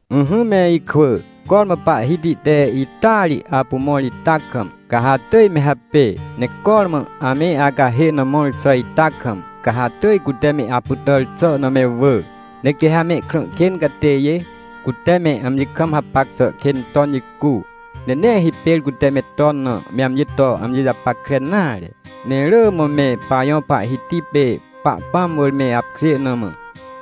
Ỹhỹ me ikwỳ, cormã Pahhiti te ita ri apu mõr ita kam, ca ha atỳj me hapê, ne cormã ame acahê na mõr xà ita kam, ca ha atỳj cute me apytàr xà na me wỳ. Ne quê ha mehkrã kên catêjê, cute me amji kam hapac xà kên ton jicu, ne nee hipêr cute me ton na me amji to amji japackre nare, ne rỳ mã me pajõ Pahhiti pê Pahpãm wỳr me apkjê na mã,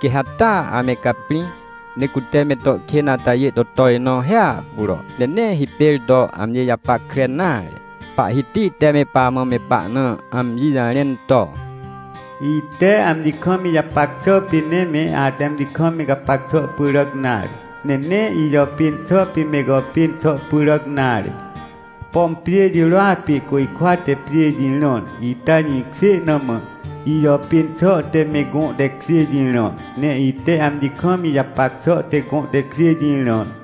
quê ha taa ame caprĩ, ne cute me to kên atajê to tojnõ hiahpuro, ne nee hipêr to amji japackre nare. Pahhiti te me pamã, me pahna amji jarẽn to: “Ite amji kam ijapac xà pê nee me ate amji kam me gapac xà pyràc nare. Ne nee ijàpên xà pê me gàpên xà pyràc nare. Pom pjê jirôa pê côjkwa te pjê jirãr, ita jĩkjê na mã, ijàpên xà te me gõ tekjê jirãr. Ne ite amji kam ijapac xà te gõ tekjê jirãr.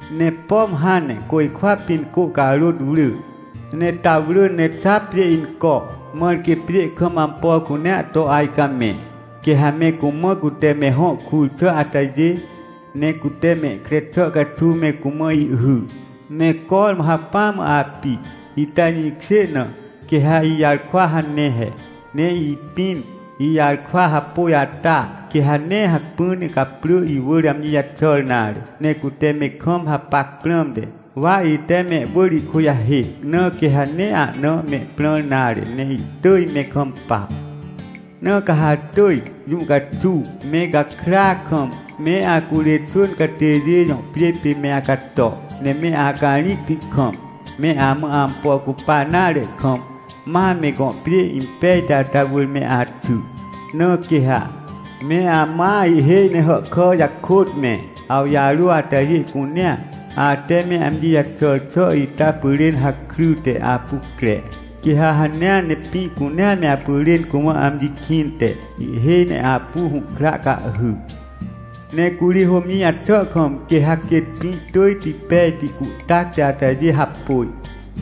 Ne pom hãn ne côjkwa pĩn cô carôt wrỳ, ne ta wrỳ, ne xa pjê inco, mãr quê pjê kam ampo cunea to ajcamẽ, quê ha me cumã cute me hõ kur xà atajê, ne cute mehkre xà caxuw me cumã ihhy, ne cormã hacpỹa mã api, ita jĩkjê na, quê ha ijarkwa hane he. Ne ipĩn, ijarkwa hapôj ata, quê ha nee hacpỹ ne caprỳ iwỳr amji jaxàr nare. Ne cute me kam hapac prãmte, wa ite mehwỳr ihkujahêc, na quê ha nee ahna mehprãr nare ne ihtỳj me kampa. Na ca ha atỳj, jũ caxuw, me gakrya kam, me acurê xwỳn catêjê jõ pjê pê me acato, ne me acarĩcti kam, me amã ampo cupa nare kam, ma me gõ pjê impejti ata wỳr me axy. Na quê ha, me amãa ihhêj ne hàhkà jakôt me, awjarô atajê cunea, ate me amji jaxàr xà ita pyrên hakryte apu cre. Quê ha hanea ne pĩ cunea me apyrên cumã amji kĩnte, ihhêj ne apu hũhkra cahhy. Ne curi hômjĩ jaxà kam, quê ha quêt pĩ tỳjti pejti cuhtacti atajê hapôj.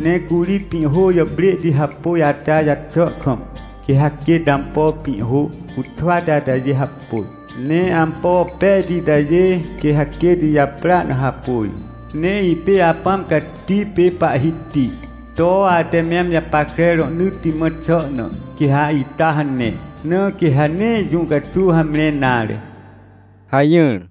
Ne curi pĩhhô jàprêhti hapôj ata jaxà kam, quê ha quêt ampo pĩhhô cuxwati atajê hapôj. Ne ampo pejti itajê, quê ha quêt ijaprỳa na hapôj. Ne ipê Apãm Cati pê Pahhiti to ate me amji japackre rohnỳtti mã xà na, quê ha ita hane. Na quê ha nee jũ caxuw hamre nare” hajỹr.